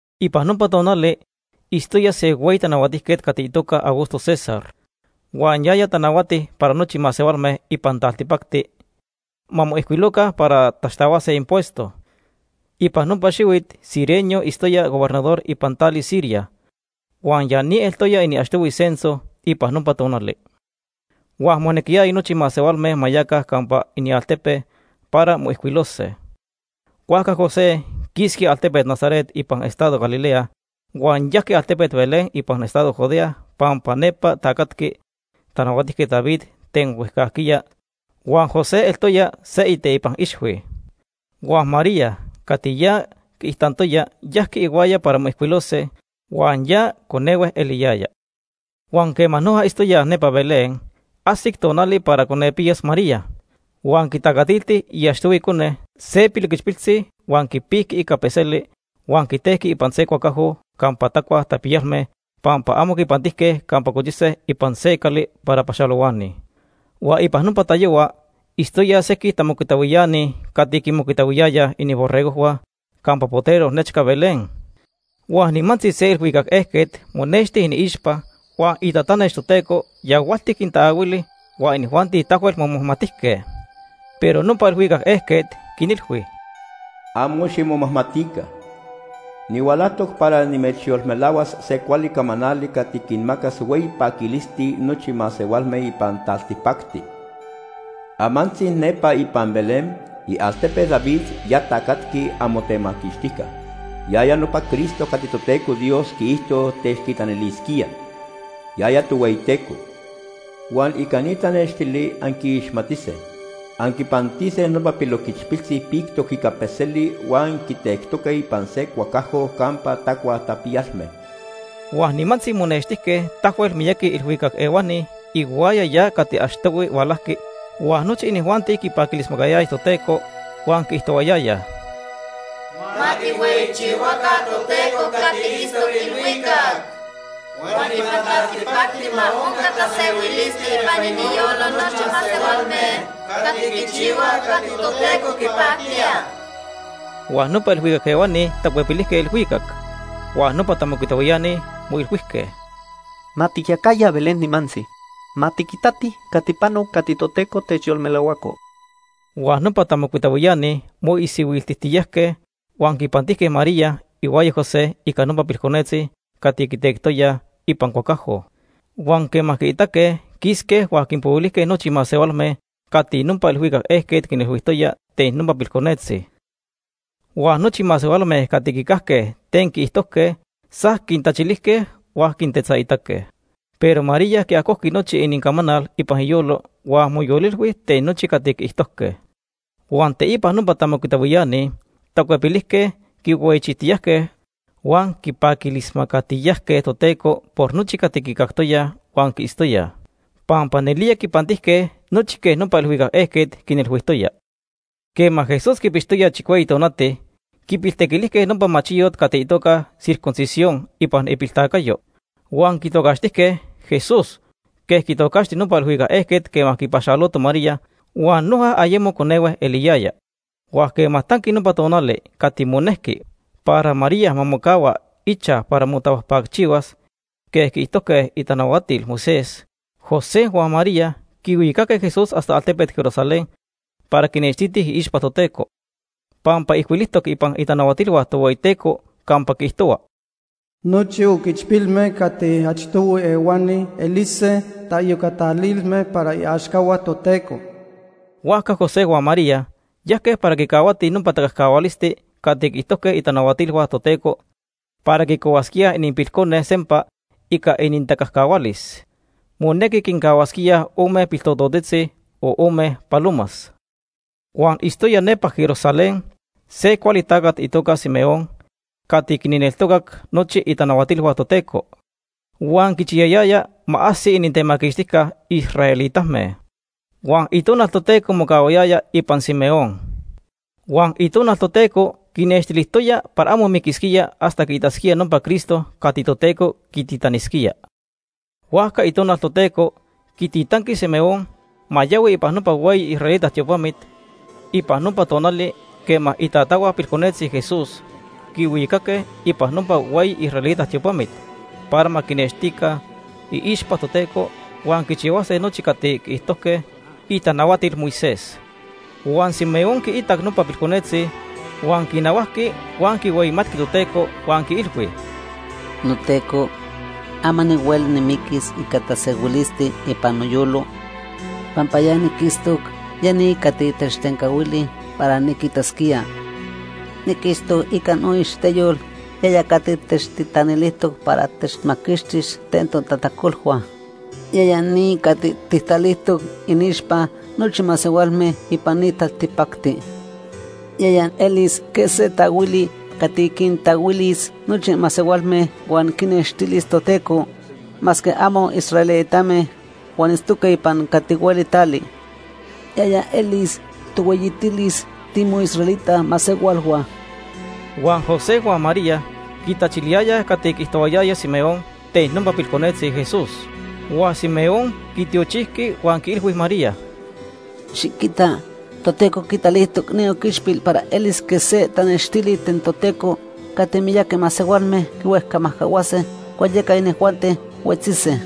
Ipan nopa tonali itztoya se hueyi tanahuatijquet cati itoca Augusto César huan yaya tanahuati para nochi masehualme ipan taltipacti ma moijcuiloca para taxtahuase impuesto. Ipan nopa xihuit Cirenio itztoya gobernador ipan tali Siria, huan ya ni eltoya iniachtohui censo ipan nopa tonali. Huan monequiyaya nochi masehualme ma yaca campa inialtepe para moijcuilose. Huajca José quisqui altepet Nazaret ipan estado Galilea huan yajqui altepet Belén ipan estado Judea pampa nepa tacatqui Tanahuatijquet David ten huejcajquiya, huan José eltoya se iteipan ixhui. Huan María, cati ya quiijtantoya, yajqui ihuaya para moijcuilose, huan ya conehue eliyaya. Huan quema noja itztoyaj nepa Belén, ajsic tonali para conepiyas María. Huan quitacatilti iachtohui cone, se piloquichpiltzi huan quipijqui ica peseli huan quitejqui ipan se cuacajo campa tacuaj tapiyalme pampa amo quipantijque campa cochise ipan se cali para paxalohuani. Huan ipan nopa tayohua itztoyaj sequij tamocuitahuiani cati quinmocuitahuiyayaj ininborregojhua campa potrero nechca Belén. Huan nimantzi se ilhuicac ejquet monexti iniixpa huan itatanex Toteco yahualtic quintaahuili huan inijuanti tahuel momajmatijque. Pero nopa ilhuicac ejquet quinilhui: “Amo ximomajmatica. Nihualajtoc para nimechyolmelahuas se cuali camanali cati quinmacas hueyi paquilisti nochi masehualme ipan taltipacti. Amantzi nepa ipan Belén, ialtepe David, ya tacatqui amotemaquixtijca. Yaya nopa Cristo cati Toteco Dios quiijto techtitanilisquía. Yaya Tohueyiteco. Huan ica ni tanextili anquiixmatise. Anquipantise nopa piloquichpiltzi pictoc ica peseli huan quitectoque ipan se cuacajo campa tacuaj tapiyalme.” Huan nimantzi monextijque tahuel miyaqui ilhuicac ehuani ihuaya ya cati achtohui hualajqui, huan nochi inijuanti quipaquilismacayayaj Toteco huan quiijtohuayayaj: “Ma tijhueyichihuaca Toteco cati itztoc ilhuicac. Huan ipan taltipacti ma onca tasehuilisti ipan iniyolo nochi masehualme cati quichihuaj cati Toteco quipactía.” Huan nopa ilhuicac ehuani tacuepilijque ilhuicac, huan nopa tamocuitahuiani moilhuijque: ―Ma tiyacajya Belén nimantzi. Ma tiquitatij cati panoc cati Toteco techyolmelahuaco. Huan nopa tamocuitahuiani moisihuiltijtiyajque huan quipantijque María ihuaya José ica nopa pilconetzi cati quitectoyaj ipan cuacajo. Huan quema quiitaque, quisque huan quinpohuilijque nochi masehualme cati nopa ilhuicac ejquet quinilhuijtoya ten nopa pilconetzi. Huan nochi masehualme cati quicajque ten quiijtojque san quintachilijque huan quitetzaitaque. Pero María quiajojqui nochi inincamanal ipan iyolo huan moyolilhui ten nochi cati quiijtojque. Huan teipa nopa tamocuitahuiani tacuepilijque quihueyichijtiyajque, huan quipaquilismacatiyajque Toteco por nochi cati quicactoyaj huan quiitztoyaj, pampa nelía quipantijque nochi quej nopa ilhuicac ejquet quinilhuijtoya. Quema Jesús quipixtoya chicueyi tonati, quipiltequilijque nopa machiyot cati itoca circuncisión ipan ipiltacayo. Huan quitocaxtijque Jesús quej quitocaxti nopa ilhuicac ejquet quema quipaxaloto María huan noja ayemo conehue eliyaya. Huan quema tanqui nopa tonali cati monejqui para María ma mocahua ichaj para motapajpacchihuas quej quiijtojque itanahuatil Moisés, José huan María quihuicaque Jesús hasta altepet Jerusalén para quinextitij iixpa Toteco. Pampa ijcuilijtoc ipan itanahuatilhua Tohueyiteco campa quiijtohua: “Nochi oquichpilme cati achtohui ehuani elise taiyocatalilme para iaxcahua Toteco.” Huajca José huan María yajque para quicahuatij nopa tacajcahualisti cati quiijtojque itanahuatilhua Toteco para quicohuasquíaj ininpilcone sempa ica inintacajcahualis. Monequi quincahuasquíaj ome piltototzitzi o ome palomas. Huan itztoya nepa Jerusalén se cuali tacat itoca Simeón cati quinneltocac nochi itanahuatilhua Toteco, huan quichiyayaya ma ajsi inintemaquixtijca israelitame. Huan Itonal Toteco mocahuayaya ipan Simeón. Huan Itonal Toteco quinextilijtoya para amo miquisquía hasta quiitasquía nopa Cristo cati Toteco quititanisquía. Huajca Itonal Toteco quititanqui Simeón ma yahui ipan nopa hueyi israelita tiopamit ipan nopa tonali quema itatahua pilconetzi Jesús quihuicaque ipan nopa hueyi israelita tiopamit para ma quinextica iixpa Toteco huan quichihuase nochi cati quiijtojque itanahuatil Moisés. Huan Simeón quiitac nopa pilconetzi, huan quinahuajqui huan quihueyimatqui Toteco huan quiilhui: “NoTeco, ama nihueli nimiquis ica tasehuilisti ipan noyolo, pampa ya niquitztoc ya ni cati techtencahuili para niquitasquía. Niquitztoc ica noixteyol yaya cati techtitanilijtoc para techmaquixtis ten totajtacolhua. Yaya ni cati tijtalijtoc iniixpa nochi masehualme ipan ni taltipacti. Yaya elis quej se taahuili cati quintaahuilis nochi masehualme huan quinnextilis Toteco, masque amo israelitame huan itztoque ipan cati hueli tali. Yaya elis tohueyitilis timoisraelita masehualhua.” Huan José huan María quitachiliyayaj cati quiijtohuayaya Simeón ten nopa pilconetzi Jesús. Huan Simeón quintiochijqui huan quiilhui María: ―Xiquita, Toteco quitalijtoc ni oquichpil para elis quej se tanextili ten Toteco cati miyaqui masehualme quihuejcamajcahuase huan yeca inijuanti huetzise.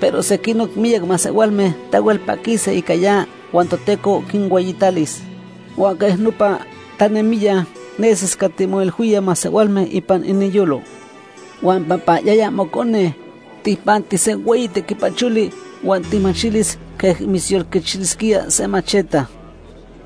Pero sequinoc miyac masehualme tahuel paquise ica ya huan Toteco quinhueyitalis. Huan quej nopa tanemijya nesis cati moilhuíaj masehualme ipan iniyolo. Huan pampa yaya mocone, tijpantis se hueyi tequipacholi huan tijmachilis quej mitzyolquechilisquíaj se macheta.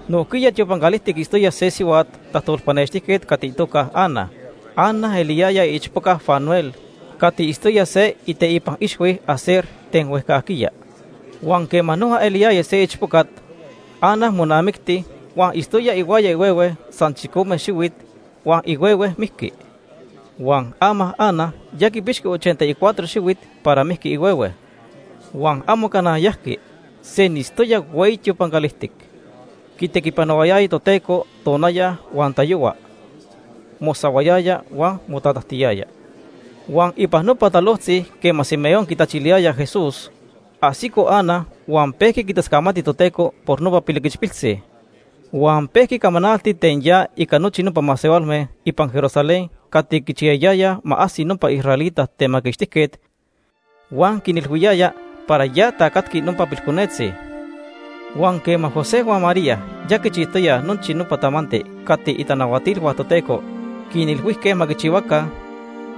Nojquiya tiopan calijtic itztoya se sihua tajtolpanextijquet cati itoca Ana. Ana eliyaya iichpoca Fanuel, cati itztoya se iteipan ixhui Aser ten huejcajquiya. Huan quema noja eliyaya se ichpocat, Ana monamicti, huan itztoya ihuaya ihuehue san chicome xihuit huan ihuehue mijqui. Huan ama Ana ya quipixqui ochenta y cuatro xihuit para mijqui ihuehue. Huan amo cana yajqui, senitztoya hueyi tiopan calijtic. Quitequipanohuayaya Toteco tonaya huan tayohua, mosahuayaya huan motatajtiyaya. Huan ipan nopa talojtzi quema Simeón quitachiliyaya Jesús, ajsico Ana, huan pejqui quitascamati Toteco por nopa piloquichpiltzi. Huan pejqui camanalti ten ya ica nochi nopa masehualme ipan Jerusalén cati quichiyayayaj ma ajsi nopa israelita Temaquixtijquet huan quinilhuiyaya para ya tacatqui nopa pilconetzi. Huan quema José huan María ya quichijtoyaj nochi nopa tamanti cati itanahuatilhua Toteco quinilhuijque ma quichihuaca,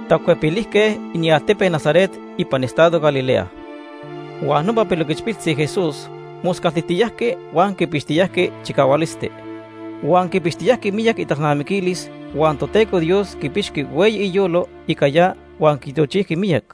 tacuepilijque inialtepe Nazaret ipan estado Galilea. Huan nopa piloquichpiltzi Jesús moscaltijtiyajqui huan quipixtiyajqui chicahualisti. Huan quipixtiyajqui miyac italnamiquilis huan Toteco Dios quipixqui hueyi iyolo ica ya huan quitiochijqui miyac.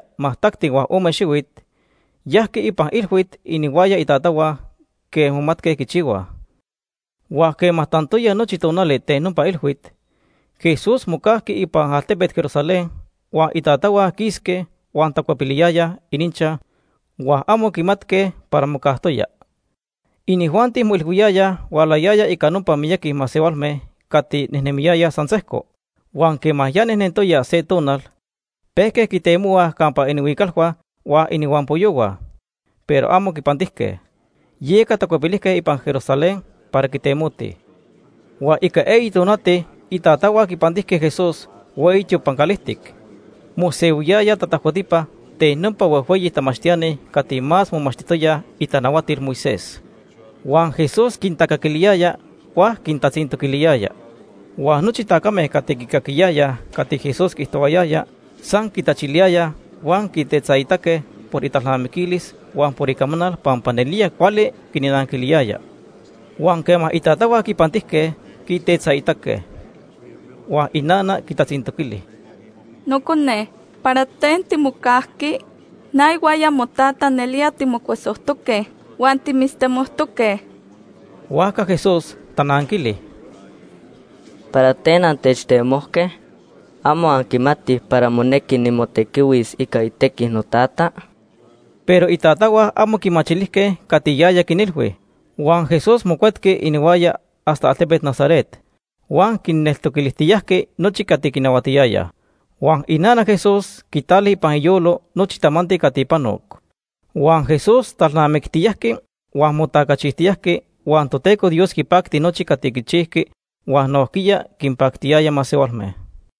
Huan quema Jesús quipixtoya majtacti huan ome xihuit, yajqui ipan ilhuit inihuaya itatahua quej momatque quichihuaj. Huan quema tantoya nochi tonali ten nopa ilhuit, Jesús mocajqui ipan altepet Jerusalén huan itatahua quisque huan tacuepiliyayaj ininchaj huan amo quimatque para mocajtoya. Inijuanti moilhuiyayaj hualayaya ica nopa miyaqui masehualme cati nejnemiyayaj san sejco. Huan quema ya nejnentoyaj se tonal, pejque quitemohuaj campa inihuicalhua huan inihuampoyohua, pero amo quipantijque. Yeca tacuepilijque ipan Jerusalén para quitemotij. Huan ica eyi tonati itatahua quipantijque Jesús hueyi tiopan calijtic, mosehuiyaya tatajcotipa ten nopa huejhueyi tamachtiani cati más momachtijtoyaj itanahuatil Moisés. Huan Jesús quintacaquiliyaya huan quintatzintoquiliyaya. Huan nochi tacame cati quicaquiyayaj cati Jesús quiijtohuayaya san quitachiliyayaj huan quitetzaitaque por italnamiquilis huan por icamanal pampa nelía cuali quinnanquiliyaya. Huan quema itatahua quipantijque, quitetzaitaque. Huan inana quitatzintoquili: ―Nocone, ¿para ten timocajqui? Na ihuaya motata nelía timocuesojtoque huan timitztemojtinentoque. Huajca Jesús tananquili: ―¿Para ten antechtemojque? ¿Amo anquimatij para monequi nimotequihuis ica itequi noTata? Pero itatahua amo quimachilijque cati yaya quinilhui. Huan Jesús mocuetqui inihuaya hasta altepet Nazaret, huan quinneltoquilijtiyajqui nochi cati quinahuatiyayaj. Huan inana Jesús quitali ipan iyolo nochi tamanti cati panoc. Huan Jesús talnamictiyajqui huan motacachijtiyajqui, huan Toteco Dios quipacti nochi cati quichijqui huan nojquiya quinpactiyaya masehualme.